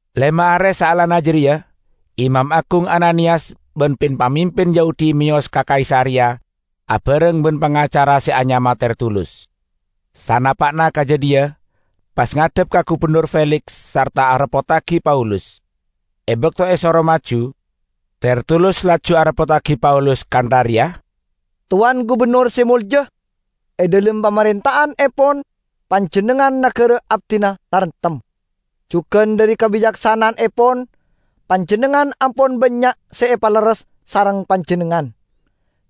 Lema are saellana jareya, Imam Agung Ananiyas ban pin-pamimpin Yahudi meyos ka Kaisareya abareng ban pangacara se anyama Tertulus. Sanapa'na ka jadhiya pas ngadhep ka Gubennor Feliks sarta areppottagi Paulus. E bakto esoro maju, Tertulus laju areppottagi Paulus kantha reya, "Towan Gubennor Se Molja! E dhalem pamarenta'annepon panjennengngan nagara abdina taremtem. Jugan dhari kabicaksana'annepon panjennengngan ampon bannya' se epalerres sareng panjennengngan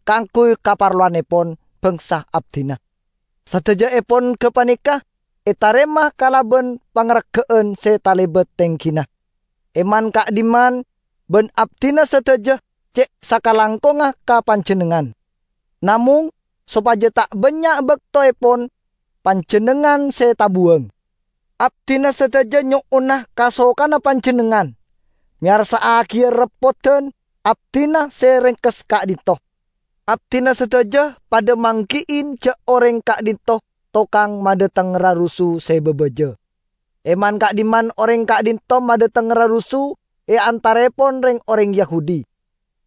kaangguy kaparlowannepon bangsa abdina. Sadajaepon gapaneka etarema kalaban pangarga'an se talebat tenggina e man-ka'dhimman, ban abdina sadaja ce' sakalangkongnga ka panjennengngan. Namong, sopaja ta' bannya' baktoepon panjennengngan se tabuwang, abdina sadaja nyo'ona kasokana panjennengngan meyarsa'agi reppodan abdina se rengkes ka'dhinto'. Abdina sadaja padha manggi'i ja' oreng ka'dhinto' tokang madhateng rarusu se babaja. E man-ka'dhimman oreng ka'dhinto' madhateng rarusu e antaraepon reng-oreng Yahudi,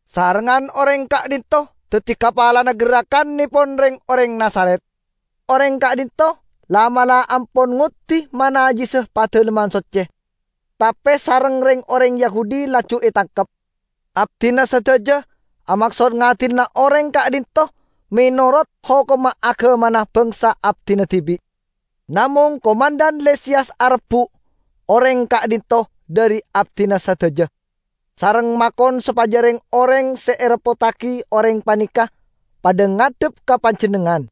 sarengngan oreng ka'dhinto' daddi kapalana gerrakannepon reng-oreng Nazaret. Oreng ka'dhinto' la'-mala' ampon ngoddi manajjisa Padalemman Socce, tape sareng reng-oreng Yahudi laju etangkep. [Abdina sadaja amaksod ngadilana oreng ka'dhinto' menorot hokomma agamana bangsa abdina dibi'. Namong komandhan Lisiyas arebbu' oreng ka'dhinto' dhari abdina sadaja, sareng makon sopaja reng-oreng se areppottagi oreng paneka padha ngadhep ka panjennengngan.]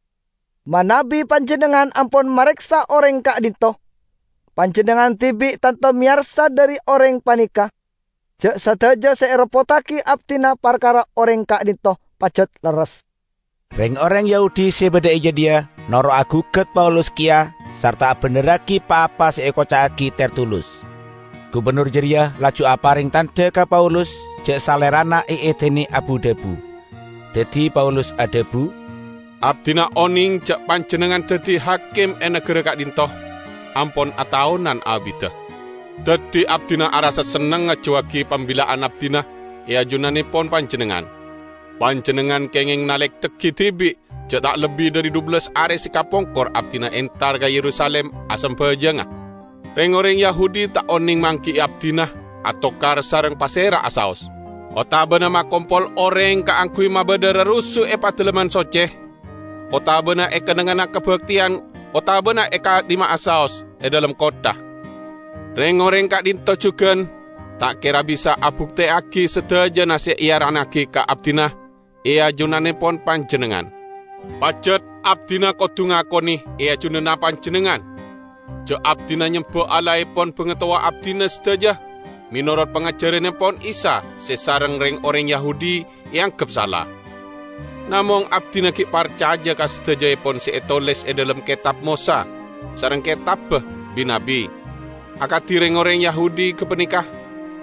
Manabi panjennengngan ampon mareksa oreng ka'dhinto', panjennengngan dibi' tanto meyarsa dhari oreng paneka ja' sadaja se ereppottagi abdina parkara oreng ka'dhinto' pajat lerres." Reng-oreng Yahudi se badha e jadhiya noro' agugat Paulus keya sarta abendherragi pa-apa se ekoca'agi Tertulus. Gubennor jareya laju apareng tandha ka Paulus ja' salerana eedine abu-dhabu. Daddi Paulus adhabu, "Abdina oneng ja' panjennengngan daddi hakim e nagara ka'dhinto' ampon ataonan abidda. Daddi abdina arassa senneng ngajuwagi pambilla'an abdina e ajunannepon panjennengngan. Panjennengngan kengeng nalektegi dibi' ja' ta' lebbi dhari dhubellas are se kapongkor abdina entar ka Yerusalim asambajanga. Reng-oreng Yahudi ta' oneng manggi'i abdina atokar sareng pasera'a saos, otabana makompol oreng kaangguy mabadha rarusu e Padalemman Socce otabana e kennengnganna kabakteyan otabana e ka'dhimma'a saos e dhalem kottha. Reng-oreng ka'dhinto' jugan ta' kera bisa abukteyagi sadajana se earannagi ka abdina e ajunannepon panjennengngan. Pajat abdina kodu ngakone e ajunanna panjennengngan ja' abdina nyemba Allahepon bangatowa abdina sadaja menorot pangajarannepon Isa se sareng reng-oreng Yahudi eanggep sala. Namong abdina gi' parcaja ka sadajaepon se etoles e dhalem Ketab Mosa sareng Ketabba Bi-nabbi. Akadi reng-oreng Yahudi gapaneka,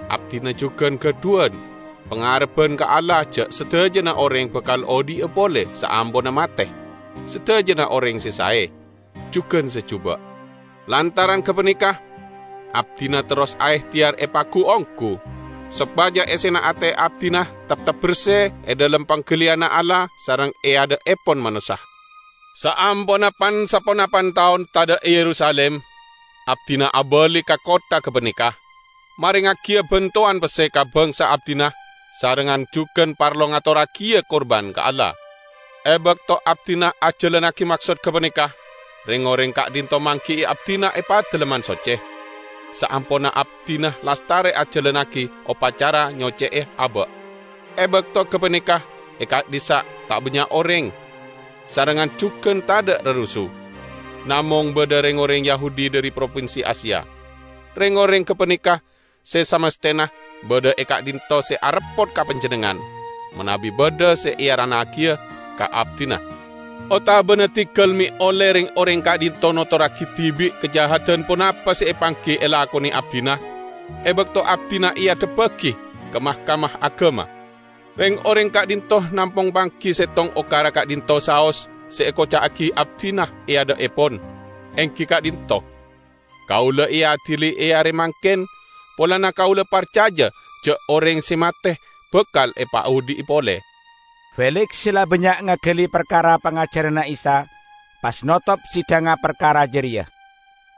abdina jugan gadhuwan pangarebban ka Allah ja' sadajana oreng bakal odhi'a pole saamponna mate -- sadajana oreng se sae, jugan se juba'! Lantaran gapaneka abdina terros aehteyar epagu-onggu, sopaja essena ate abdina teptep berse e dhalem panggaliyanna Allah sareng e adha'epon manossa. Saamponna pan-saponapan taon tadha' e Yerusalim, abdina abali ka kottha gapaneka, marengngagiya bantowan pesse ka bangsa abdina sarengngan jugan parlo ngatorragiya kurban ka Allah. E bakto abdina ajalannagi maksod gapaneka, reng-oreng ka'dhinto' manggi'i abdina e Padalemman Socce, saamponna abdina lastare ajalannagi opacara nyocce'e aba'. E bakto gapaneka e ka'dhissa' ta' bannya' oreng, sarengngan jugan tadha' rarusu. Namong badha reng-oreng Yahudi dhari propinsi Asia. Reng-oreng gapaneka se samasthena badha e ka'dhinto' se areppot ka panjennengngan, manabi badha se earannagiya ka abdina. Otabana diggal me' olle reng-oreng ka'dhinto' notorragi dibi' kajahadan ponapa se epanggi elakone abdina e bakto abdina eadhebbagi ka Mahkamah Agama. Reng-oreng ka'dhinto' namong manggi settong okara ka'dhinto' saos se ekoca'agi abdina e adha'epon, enggi ka'dhinto': Kaula eadili e are mangken polana kaula parcaja ja' oreng se mate bakal epaodhi'a pole." Feliks se la bannya' ngagali parkara pangajaranna Isa, pas notop sidhangnga parkara jareya.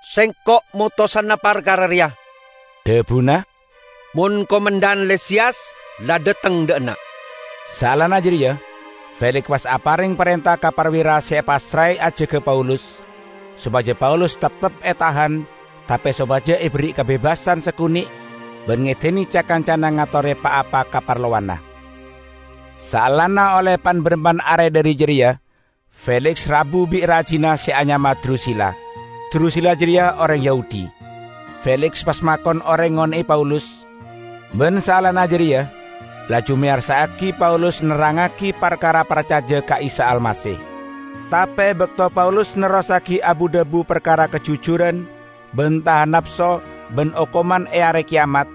"Sengko' motosana parkara reya," dhabuna, "mon komandhan Lisiyas la dhateng dha' enna'." Saellana jareya, Feliks pas apareng parenta ka parwira se epassrae ajaga Paulus, sopaja Paulus teptep etahan tape sopaja eberri'i kabebasan sakone' ban ngedine ca-kancana ngatore pa-apa kaparlowanna. Saellana olle pan-barampan are dhari jareya Feliks rabu bi' rajina se anyama Drusila; Drusila jareya oreng Yahudi. Feliks pas makon oreng ngone'e Paulus, ban saellana jareya laju meyarsa'agi Paulus nerrangngagi parkara parcaja ka Isa Almasih. Tape e bakto Paulus nerrossagi abu-dhabu parkara kajujuran ban tahan napso ban okoman e Are Keyamat,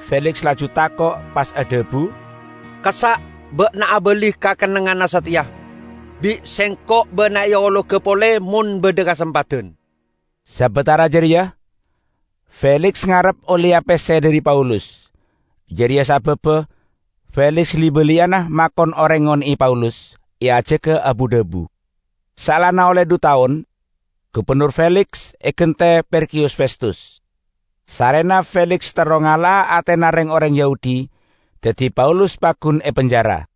Feliks laju tako', pas adhabu, "Kassa' ba'na abali ka kennengnganna sateya. Bi' sengko' ba'na eologa pole mon badha kasempadan." Sabatara jareya Feliks ngarep olleya pesse dhari Paulus. Jareya sababba Feliks li-baliyana makon oreng ngone'e Paulus, eajaga abu-dhabu. Saellana olle dhu taon, Gubennor Feliks egante Perkiyus Festus. Sarrena Feliks terro ngala'a atena reng-oreng Yahudi, daddi Paulus paggun epenjara.